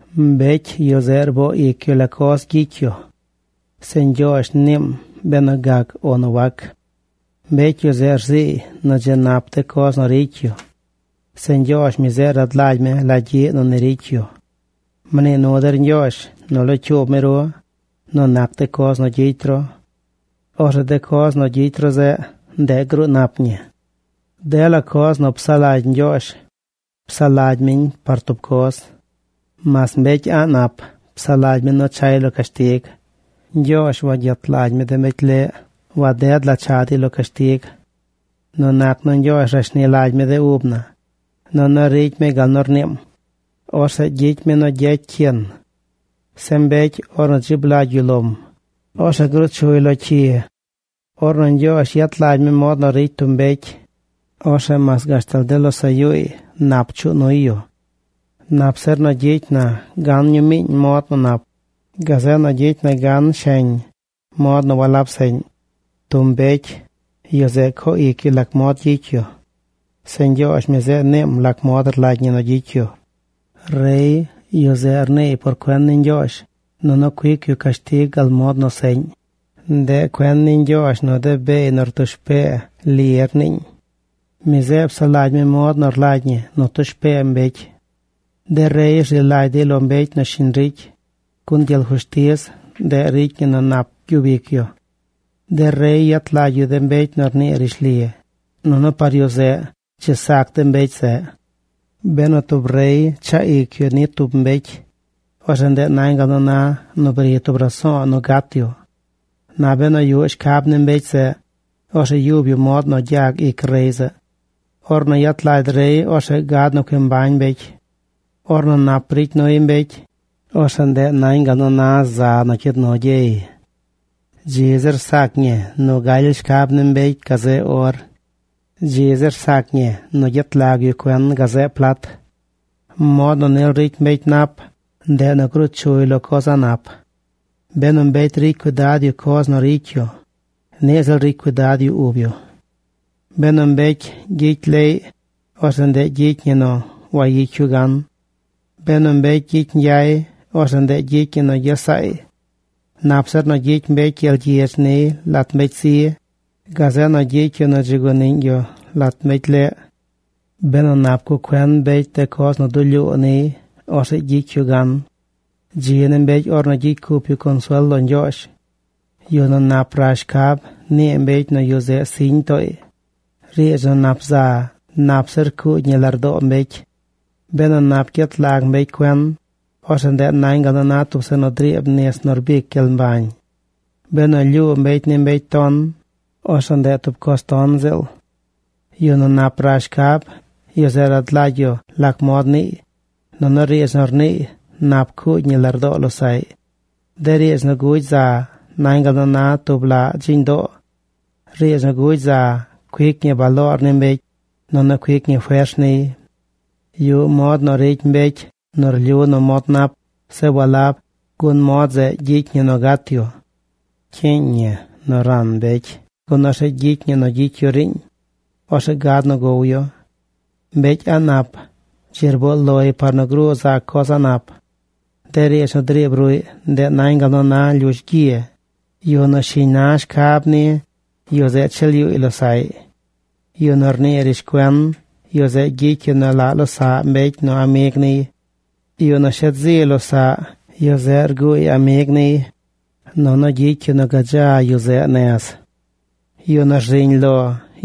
Mbecy, yu zeꞌ rboo ic yu la coz gyicy yu. Zeꞌ Ñgyoozh niim benu gac o nu wac. Mbecy, yu zeꞌ rziiy nu dzi nap de coz nu ricy yu. Zeꞌ Ñgyoozh, mi zeꞌ rad lagy mi la gyiꞌ nu ni ricy yu. Mnii nu der Ñgyoozh nu locyuub mi ru nu nac de coz nu gyicy ru. Orzeꞌ de coz nu gyicy ru zeꞌ, ndeꞌ gruu nap ñi. Dela coz nu psaꞌ lagy Ñgyoozh, psaꞌ lagy miñ par tub coz. Mas mbecy a̱ꞌ nap, psaꞌ lagy mi nu chay lo cashtig. Ñgyoozh wayet lagy mi de mbecy leꞌ. Waded la cha dey lo cashtig. Nu nac nu Ñgyoozh rashni lagy mi de ub na, nunu ricy mi gal nu rniim, orzeꞌ gyicy mi nu gyecy cyin. Zeꞌ mbecy, ornu dzib lagy yu lom, orzeꞌ gruu chuy lo cyi. Ornu Ñgyoozh yet lagy mi mod nu ricy tub mbecy, orzeꞌ mas gashtal de losaꞌ yuuy nap chuꞌ nuy yu. Nap zir nu gyicy na gan ñumiiñ mod nu nap, gazeꞌ nu gyicy na gan sheñ mod nu walab seꞌñ. Tub mbecy, yu zeꞌ co ic yu lac mod gyicy yu. Zeꞌ Ñgyoozh, mi zeꞌ niim lac mod rlagy ñi nu gyicy yu. Rey, yu zeꞌ rniiy por cuen ni Ñgyoozh, nunu cuic yu cashtig gal mod nu seꞌñ. Ndeꞌ cuen ni Ñgyoozh nu de beey nu rtush pee, li rniiñ. Mi zeꞌ psaꞌ lagy mi mod nu rlagy ñi nu tush pee mbecy. De rey rzi lagy dey lo mbecy nu shiñ ricy, gun gyel fushtiz, ndeꞌ ricy ñi nu nap gyub ic yu. De rey yet lagy yu de mbecy nu rnii rishli, nunu par yu zeꞌ dzi sac de mbecy zeꞌ. Benu tub rey chaꞌ ic yu ni tub mbecy, orzeꞌ ndeꞌ nañ gal na nu bri tub raso̱o̱ nu gat yu. Na benu yuꞌ shcab ni mbecy zeꞌ, orzeꞌ yub yu mod nu gyag ic rey zeꞌ. Ornu yet lagy rey, orzeꞌ gad nu cui mbañ mbecy. Ornu nap ricy nuy mbecy, orzeꞌ ndeꞌ nañ gal na za nu cyid nu gyey. Dzi zir sac ñi nu galy shcab ni mbecy gazeꞌ or. Dzi zir sac ñi nu gyet lag yu cuen gazeꞌ plat. Mod nu nil ricy mbecy nap, ndeꞌ nu gruu chuy lo coz a̱ꞌ nap. Benu mbecy ricy cuidad yu coz nu ricy yu, niꞌ ziꞌl ricy cuidad ub yu. Benu mbecy gyicy leꞌy, orzeꞌ ndeꞌ gyicy ñi nu wayicy yu gan. Benu mbecy gyicy ñgyay, orzeꞌ ndeꞌ gyicy ñi nu gyes saay. Nap zir nu gyicy mbecy gyel gyidz niy lat mbecy zi, gazeꞌ nu gyicy yu nu dzi guaniꞌñ yu lat mbecy leꞌ. Benu nap cuꞌ cuen mbecy de coz nu dulyuu niy orzeꞌ gyicy yu gan. ¡Dzi ni mbecy ornu gyicy cup yu consuel lo Ñgyoozh! Yu nu nap rash shcab, nii mbecy nu yu zeꞌ siñ tooy. Riidz nu nap za, nap zir rcuugy ñi lardoo mbecy. Benu nap gyet lag mbecy cuen, orzeꞌ ndeꞌ nañ gal na tub zeꞌ nu driib nis nu rbic gyel mbañ. Benu lyuu mbecy ni mbecy ton, orzeꞌ ndeꞌ tub coz ton ziꞌl. Yu nu nap rash shcab, yu zeꞌ rad lagy yu lac mod niiy, nunu riidz nu rniiy nap cuugy ñi lardoo losaꞌy. De riidz nu gugy za nañ gal nu na tub laꞌ dziñ doo. Riidz nu gugy za cuic ñi baloor ni mbecy, nunu cuic ñi fers niy. Yuꞌ mod nu ricy mbecy nu rlyu nu mod nap. Zeꞌ walab, gun mod zeꞌ gyicy ñi nu gat yu. Cyiiñ ñi nu ran mbecy, gun orzeꞌ gyicy ñi nu gyicy yu riiñ. Orzeꞌ gad nu gow yu. Mbecy a̱ꞌ nap, dzi rboo loy par nu gruu zac coz a̱ꞌ nap. De riidz nu driib ruꞌy, ndeꞌ nañ gal nu na lyush gyi. Yu nu shiñ na shcab ni, yu zeꞌ cheel yuuy losaꞌy. Yu nu rnii rishcuen, yu zeꞌ gyicy yu nu laꞌ losaꞌ mbecy nu amig niy. Yu nu shet zi losaꞌ, yu zeꞌ rguuy amig niy, nunu ricy yu nu gadza yu zeꞌ nez. Yu nu rziñ lo,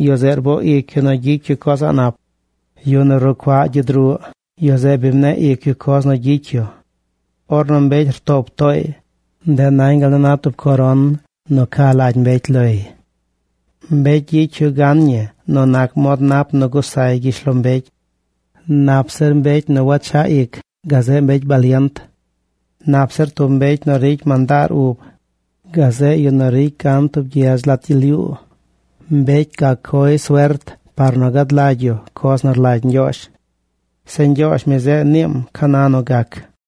yu zeꞌ rboo ic yu nu gyicy yu coz a̱ꞌ nap. Yu nu rucuaꞌ gyid ruꞌ, yu zeꞌ bi mneꞌ ic yu coz nu gyicy yu. Ornu mbecy rtop tooy, ndeꞌ nañ gal na tub coron nu ca lagy mbecy lo. Mbecy gyicy yu gan ñi nu nac mod nap nu gusay gyishlombecy. Nap zir mbecy nu wachaꞌ ic gazeꞌ mbecy balient. Nap zir tub mbecy nu ricy mandaar ub, gazeꞌ yu nu ricy gan tub gyedz lat gyel yuu. Mbecy gac coy suert par nu gad lagy yu coz nu rlagy Ñgyoozh. Zeꞌ Ñgyoozh, mi zeꞌ niim ca na nu gac.